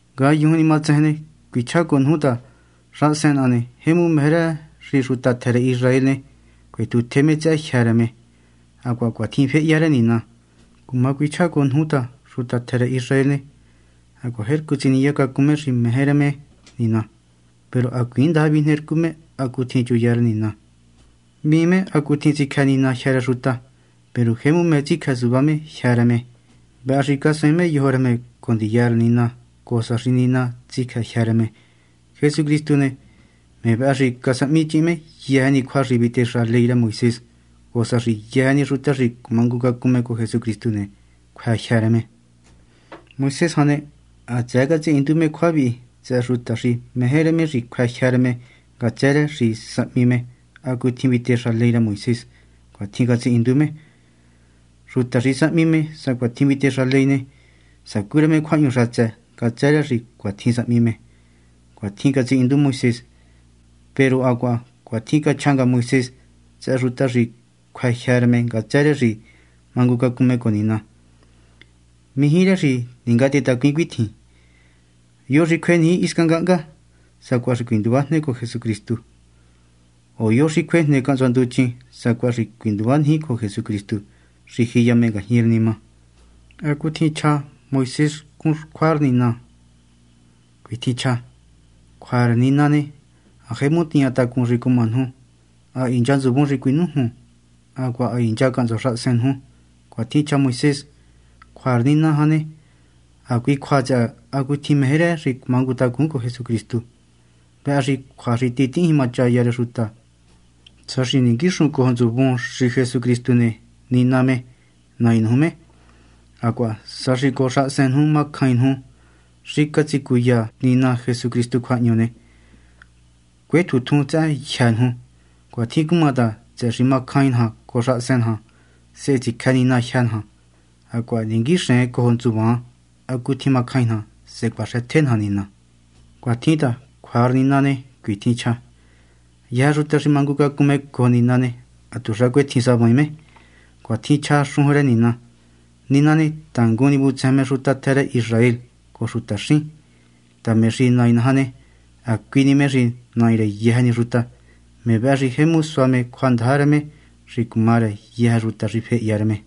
Ngayujun ni matsejen ne, cuichjá cojo nuju ta xahasen naha ne, jemu meje rë xi xuta tjë rë Israel ne, cuetjutje me tsëhë jyë́ rë me. Hacuaha cuatjin féhya rë Nina. Cuma cuichjá cojo nuju ta xuta tjë rë Israel ne, hacuaha jercu tsiniya cacun me xi meje rë me Nina. Peru hacuiin ndaja vijnercu me hacutjin chuya rë Nina. Hvíin me hacutjin tsicjë Nina jyë́ rë xuta. Peru jemu meje tsicjë suvá me jyë́ rë me. Vëhë xi casuaain me yojo rë me cojo ndiya rë Nina, cojo sa xi Nina tsicjë me jyë́ rë me. Jesucristu ne, me vëhë xi casahmichihin me yëjë ni cjua xi vitexa ley rë Moisés, cojo sa xi yëjë ni xuta xi cumangucacun me cojo Jesucristu ne, cjuë jyë́ rë me. Moisés jan ne, hatsëë catsihindu me cjua vihi tsëhë xuta xi meje rë me xi cjuë jyë́ rë me ngatsë rë xi sahmi me hacutjin vitexa ley rë Moisés. Cuitjin catsihindu me: “Xuta xi sahmi me sacuatjin vitexa ley ne, sacú rë me cjuahñu xatsë ngatsë rë xi cuatjin sahmi me.” Cuatjin catsihindu Moisés. Peru hacuaha cuitjin cachja nga Moisés tsëhë xuta xi cjuë jyë́ rë me ngatsë rë xi mangucacun me cojo Nina: “Mijí rë xi ningatehetacuin cuitjin: ¿Yo xi cjueniji hisca ngahnga?” ―sacuaha xi cuinduvajne cojo Jesucristu―; o ¿Yo xi cjuejne cahntsua nduchin? ―sacuaha xi cuinduvaniji cojo Jesucristu xi jiya me ngajñi rë nima. ¿Hacutjin chja Moisés xcun cjua rë Nina ni? Cuitjin chja: “Cjua rë Nina ne, ha jemu tiña tacun xi cuma nuju; ha hincha ntsuvun xi cuinújun, hacuaha ha hincha cahntsua xahasen nuju.” Cuatjin cachja Moisés. Cjua rë Nina jan ne, hacui cjua tsëhë hacutjin meje rë xi cumangutacun cojo Jesucristu, vëhë cjua xi titihín jimachaya rë xuta. Sa xi ninguíxun cojo ntsuvun xi Jesucristu ne, Nina me, Nai nuju me, hacuaha sa xi cojo xahasen nuju macjain nuju xi catsicuya Nina Jesucristu cjuahñu ne, cuétjuntjun tsëhë jyë́ nuju. Cuatjin cuma ta, tsëhë xi macjain naja cojo xahasen naja, sehe tsicjë Nina jyë́ naja, hacuaha ninguixen cojo ntsuvan hacutjin macjain naja, sehe cuaxëtje naja Nina. Cuatjin ta, cjua rë Nina ne, cuitjin chja: “Yëjë xuta xi mangucacun cojo Nina ne, hatuxa cuetjin savaain me.” Cuatjin chja xujun rë Nina. Nina ne, tangun ni vutsejen me xuta tjë rë Israel cojo xutaxín ta me xi Nai naja ne, hacui ni me xi Nai rë yëjë ni xuta. Me vëhë xi jemu sua me cjuandaja rë me xi cuma rë yëjë xuta xi fehya rë me.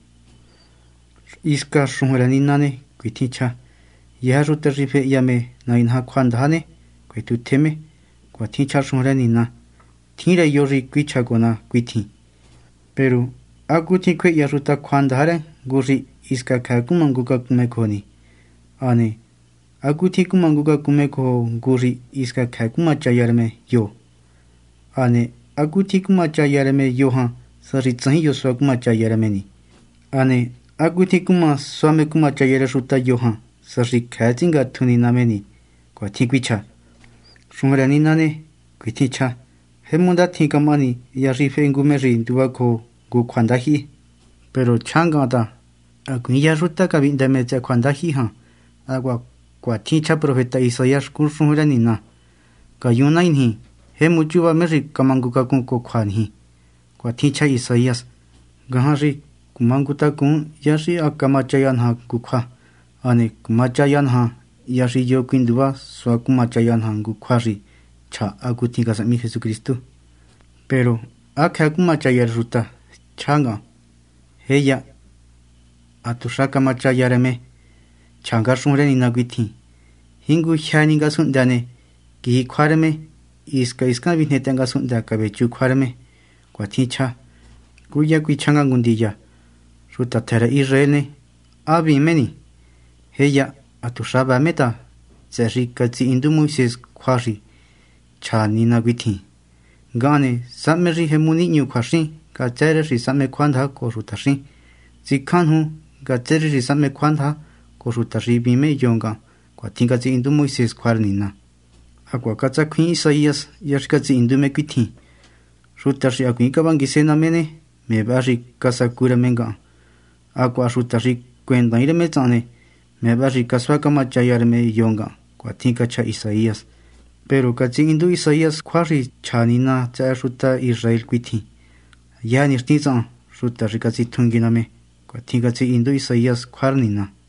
Hisca xujun rë Nina ne, cuitjin chja: “Yëjë xuta xi fehya me Nai naja cjuandaja ne, cuetjutje me.” Cuatjin chja xujun rë Nina. Tjin rë yo xi cuichja cojo ná cuitjin: “Peru ¿hacutjin cuma cjuehya xuta cjuandaja rë ngu xi hisca cjëë cumangucacun me cojo ni? Hane ¿hacutjin cumangucacun me cojo ngu xi hisca cjëë cumachaya rë me yo ni? Hane ¿hacutjin cumachaya rë me yo jan, sa xi tsajin yo sua cumachaya rë me ni? Hane ¿hacutjin cuma cjue sua me cumachaya rë xuta yo jan, sa xi cjëë tsingatju Nina me ni?” Cuatjin cuichja. Xujun rë Nina ne, cuitjin chja: “Jemu ndatjin camahani hya xi fehe ngu me xi nduvacojo ngu cjuandajyihi.” Peru chjá ngahan ta hacuiin yëjë xuta cavihndë me tsëhë cjuandajyihi jan. Hacuaha cuatjin chja profeta Isaías xcun xujun rë Nina: “Ngayun, Nai niji, jemu chúva me xi camangucacun cojo cjua niji.” Cuatjin chja Isaías. Ngajan xi cumangutacun hya xi ha camachaya naja ngu cjua, hane cumachaya naja hya xi yo cuinduva sua cumachaya naja ngu cjua xi chja hacutjin casahmi Cristu. Peru ¿há cjëë cumachaya rë xuta? chjá han. ¡Jéya, hatuxa camachaya rë me! Chja nga xujun rë Nina cuitjin: Jingujyë ni ngasunhndë ne, quiji cjua rë me, hisca hiscan vijnetaha ngasunhndë cavechu cjua rë me. Cuatjin chja. Cúya cuichjá nga ngu ndiya: Xuta tjë rë Israel ne, ¿há hvíin me ni? ¡Jéya! hatuxa vëë me ta, tsëhë xi catsihindu Moisés cjua xi cachja Nina cuitjin: Ngahan ne, sahme xi jemu nihñu cjuaxín ngatsë rë xi sahme cjuandaja cojo xutaxín; tsicján nuju ngatsë rë xi sahme cjuandaja cojo xuta xi hvíin me yo ngahan. Cuatjin catsihindu Moisés cjua rë Nina. Hacuaha catsacjuiin Isaías hya xi catsihindu me cuitjin: Xuta xi hacuiin cavanguise ná me ne, me vëhë casacu rë me ngahan; hacuaha xuta xi cuendaain rë me tsahan ne, me vëhë xi casuá camachaya rë me yo ngahan. Cuatjin cachja Isaías. Peru catsihindu Isaías cjua xi cachja Nina tsëhë xuta Israel cuitjin: “Yëjë nixtin tsahan, xuta xi catsitjungui ná me.” Cuatjin catsihindu Isaías cjua rë Nina.